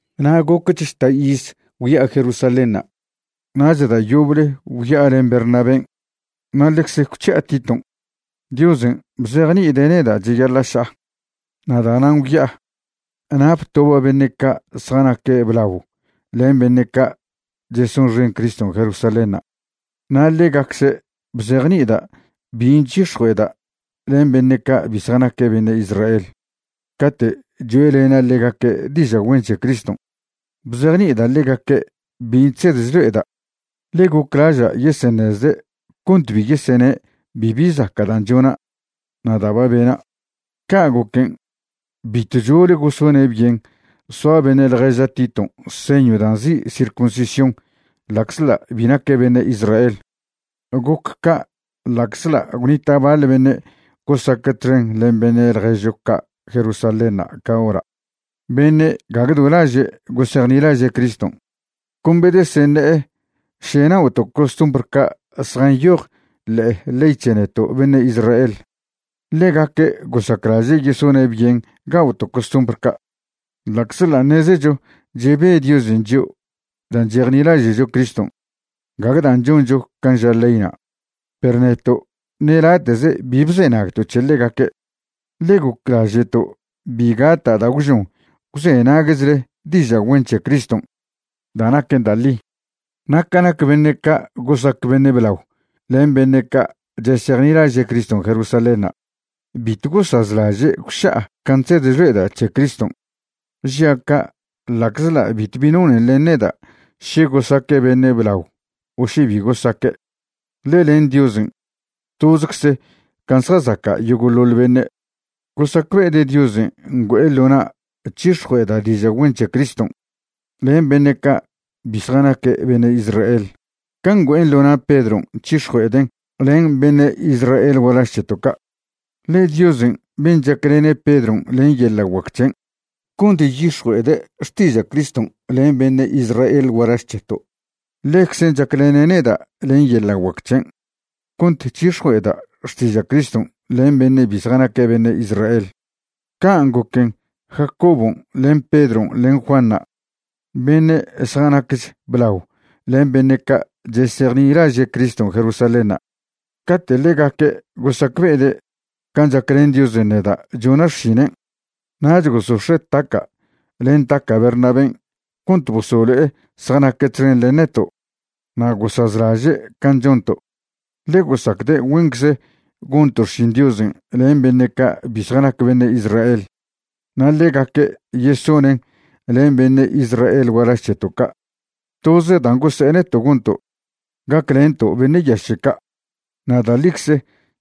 Na' gocch žta' iz gwya'a Jerusalénṉa' nach da' yoble gwya'a len Bernabén', na' ḻecze gwc̱hi'a Titon'. Diosen' bzejni'ide' neda' cheyaḻa' ša'a, na' da'nan' gwya'a. Na' btoba' beṉe' ca' zjanaque' blao len beṉe' ca' chesonxen Criston' Jerusalénṉa' na' ḻegacze' bzejni'ida' bin' chyix̱jue'eda' len beṉe' ca' bi zjanaque' beṉe' Israel cate' choe'lena' ḻegaque' diža' güen c̱he Criston'. Bzejni'ida' ḻegaque' bin' chsed chlo'eda', ḻe goclaža' yeseṉezde' cont bi yesene' bibi zaca' dan' chona' na' da' ba bena'. Ca' goquen' bitw chole gosone' byen soa beṉe' ḻježa' Titon' señw dan' nzi' circuncisión ḻa'czḻa' bi naque' beṉe' Israel. Goc ca' ḻa'czḻa' gwnita' baḻ beṉe' gosaque' txen len beṉe' ḻježcho ca' Jerusalénṉa' ca hora', beṉe' gague do laže' gosejnilaže' Criston', con bedeseṉe'e še na'oto' costumbr ca' zjanyoj ḻe'e ley c̱he neto' beṉe' Israel. Ḻegaque' gosaclaže' yesone' byen ga'oto' costumbr ca', ḻa'czḻa' ṉezecho chebe Diosen' chio' dan' chejnilaže'cho Criston', gague dan' choncho can' ža leyna'. Perw neto' ṉe late'ze bi bzenagto' c̱he ḻegaque', ḻe goclaže'to' bi gata' da' gwžon gwzenaguechle diža' güen c̱he Criston' da' naquen da' ḻi. Na' ca nac beṉe' ca' gosac beṉe' blao len beṉe' ca' chesejnilaže' Criston' Jerusalénṉa', bitw gosazlaže' gwša'a can' chsed chlo'eda' c̱he Criston'. (Žia' ca' ḻa'czḻa' bitw bi nonen len neda' še gosaque' beṉe' blao o še bi gosaque', ḻe len Diosen' tozcze can' zjazaca' yogo'ḻoḻ beṉe'.) Gosacbe'ede' Diosen' ngüe'e ḻo na' chyix̱jue'eda' diža' güen c̱he Criston' len beṉe' ca' bi zjanaque' beṉe' Israel can' ngüe'en ḻo na' Pedron' chyix̱jue'eden' len beṉe' Israel gualaž c̱heto' ca'. Ḻe Diosen' ben' chaclene' Pedron' len yeḻa' guac c̱hen' cont chyix̱jue'ede' xtiža' Criston' len beṉe' Israel gualaž c̱heto', ḻeczen' chaclene' neda' len yeḻa' guac c̱hen' cont chyix̱jue'eda' xtiža' Criston' len beṉe' bi zjanaque' beṉe' Israel. Can' goquen', Jacobon' len Pedron' len Juanṉa', beṉe' zjanacch blao len beṉe' ca' chesejnilaže' Criston' Jerusalénṉa', cate' ḻegaque' gosacbe'ede' can' chaclen Diosen' neda' chona' xšinen', nach gosox̱e' taca' len taca' Bernabén' cont bosolo'e zjanaque' txen len neto' na' gosazlaže' can' chonto'. Ḻe gosacde' güencze gonto' xšin Diosen' len beṉe' ca' bi zjanac beṉe' Israel na' ḻegaque' yesonen' len beṉe' Israel gualaž c̱heto' ca'. Toze dan' gose'e neto' gonto', gaclento' beṉe' yaše' ca'. Na' da' ḻicze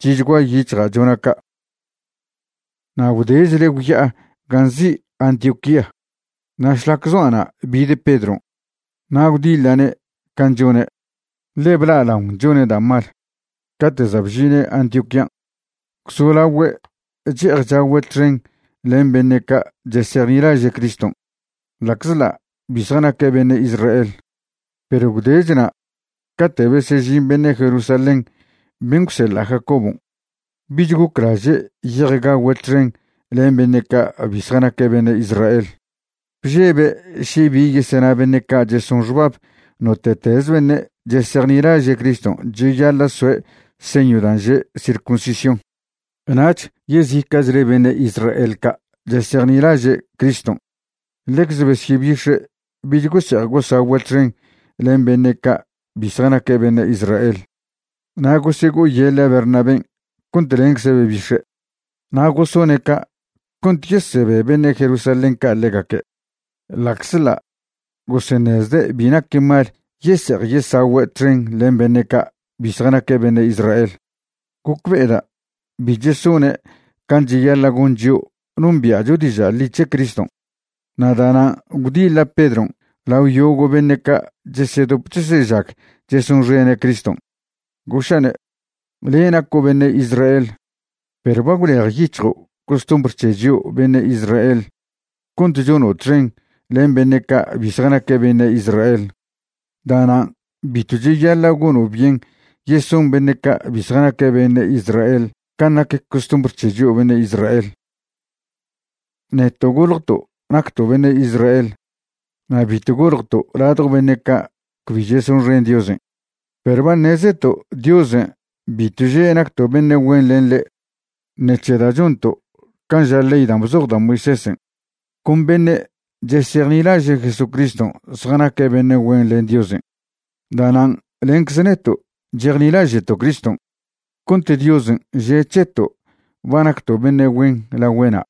chi'chgua yic̱hja' chona' ca'. Na' gwdechle gwya'a gan' nzi' Antioquía. Na' šlac zoa' na' bid Pedron', na' gwdiḻa'ne' can' chone', ḻe bla'alaon chone' da' mal. Cate' za' bžine' Antioquían', gwzolagüe' che'ej chagüe' txen len beṉe' ca' chesejnilaže' Criston' ḻa'czḻa' bi zjanaque' beṉe' Israel; perw gwdechna' cate' besežin beṉe' Jerusalén ben' gwseḻa' Jacobon', bich goclaže' ye'ej gagüe' txen len beṉe' ca' bi zjanaque' beṉe' Israel. Bžebe' še bi yesena beṉe' ca' cheson xbab note'teze beṉe' chejnilaže' Criston' cheyaḻa' soe' señw dan' že' circuncisión. Nach yezica'chle beṉe' Israel ca' chesejnilaže' Criston' ḻecze besyebix̱e' bich gose'ej gosagüe' txen len beṉe' ca' bi zjanaque' beṉe' Israel, na' gosego'oyeḻe' Bernabén' cont lencze' bebix̱e'. Na' gosone' ca' cont yesebe beṉe' Jerusalén ca' ḻegaque', ḻa'czḻa' goseṉezde' bi naquen mal yese'ej yesagüe' txen len beṉe' ca' bi zjanaque' beṉe' Israel. Gocbe'eda' bi chesone' can' cheyaḻa' gon chio' nombia'cho diža' ḻi c̱he Criston'. Na' da'nan' gwdiḻa' Pedron' lao yogo' beṉe' ca' chesedop chesežag chesonxene' Criston', goša'ne': “Le' naco' beṉe' Israel, perw ba gwlejyic̱hjo' costumbr c̱he chio' beṉe' Israel cont chono' txen len beṉe' ca' bi zjanaque' beṉe' Israel. Da'nan' bitw cheyaḻa' gono' byen yeson beṉe' ca' bi zjanaque' beṉe' Israel can' nac costumbr c̱he chio' beṉe' Israel.” Neto' goljto' nacto' beṉe' Israel na' bitw goljto' ladjo beṉe' ca' cbi chesonxen Diosen'. Perw ba ṉezeto' Diosen' bitw že' nacto' beṉe' güen len ḻe' ṉec̱he da' chonto' can' ža ley dan' bzoj da' Moisésen'. Con beṉe' chesejnilaže' Jesucriston' zjanaque' beṉe' güen len Diosen'. Da'nan' lencze neto' chejnilaže'to' Criston' cont Diosen' že' c̱heto' ba nacto' beṉe' güen lagüe'na';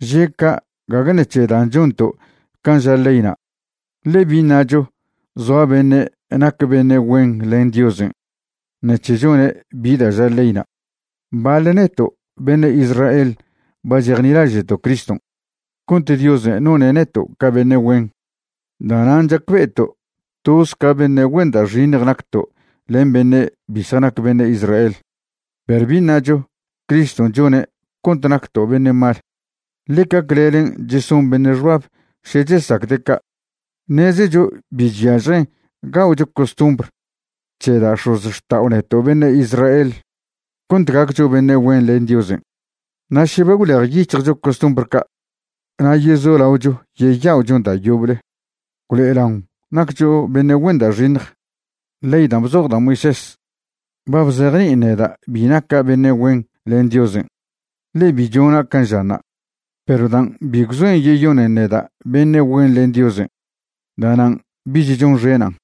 že' ca' gague ṉec̱he dan' chonto' can' ža leyna'. Ḻe bi ṉacho zoa beṉe' nac beṉe' güen len Diosen' ṉec̱he chone' bi da' ža leyna'. Baḻ neto' beṉe' Israel ba chejnilaže'to' Criston' cont Diosen' none' neto' ca beṉe' güen. Da'nan' chacbe'eto' toz ca beṉe' güen da' xiṉj nacto' len beṉe' bi zjanac beṉe' Israel. Perw bi ṉacho Criston' chone' cont nacto' beṉe' mal. Ḻeca clelen' cheson beṉe' xbab še chesacde' ca'. Ṉezecho bi chyažjen ga'ocho costumbr c̱he da' x̱ozxta'o neto' beṉe' Israel cont gaccho beṉe' güen len Diosen'. Na' še ba gwlejyic̱hjcho costumbr ca' na' yezolaocho yeya'ochon da' yoble, gwlo'elaon naccho beṉe' güen da' xiṉj. Ley dan' bzoj da' Moisés ba bzejni'in neda' bi naca' beṉe' güen len Diosen', ḻe bi chona' can' žanṉa'. Perw dan' bi gwzoen yeyonen neda' beṉe' güen len Diosen', da'nan' bich chonxenan',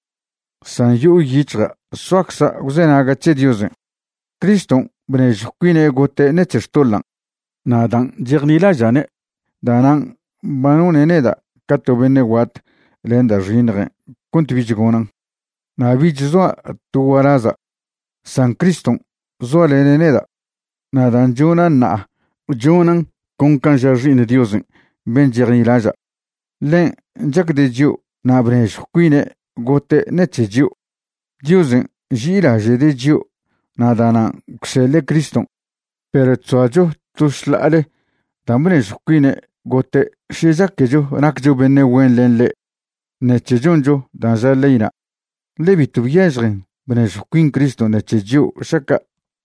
san yo'o yic̱hja' soacza' gwzenaga' c̱he Diosen'. Criston' bnežjw cuine' gote' ṉec̱he xtoḻan', na' dan' chejnilaža'ne' da'nan' ba none' neda' ca to beṉe' guat len da' xiṉjen' cont bich gonan'. Na' bich zoa' to gualaza', san Criston' zoalene' neda'. Na' dan' chona' ṉa'a chonan' con can' ža' Xi'iṉ Diosen' ben' chejnilaža'. Ḻen' chacde' chio' na' bnežjw cuine' gote' ṉec̱he chio'. Diosen' nži'ilaže'de' chio' na' da'nan' gwseḻe' Criston', perw chzoacho to šḻa'ale dan' bnežjw cuine' gote' še chaquecho naccho beṉe' güen len ḻe' ṉec̱he choncho dan' ža leyna', ḻe bitw byažjen bnežjw cuin Criston' ṉec̱he chio' šaca'.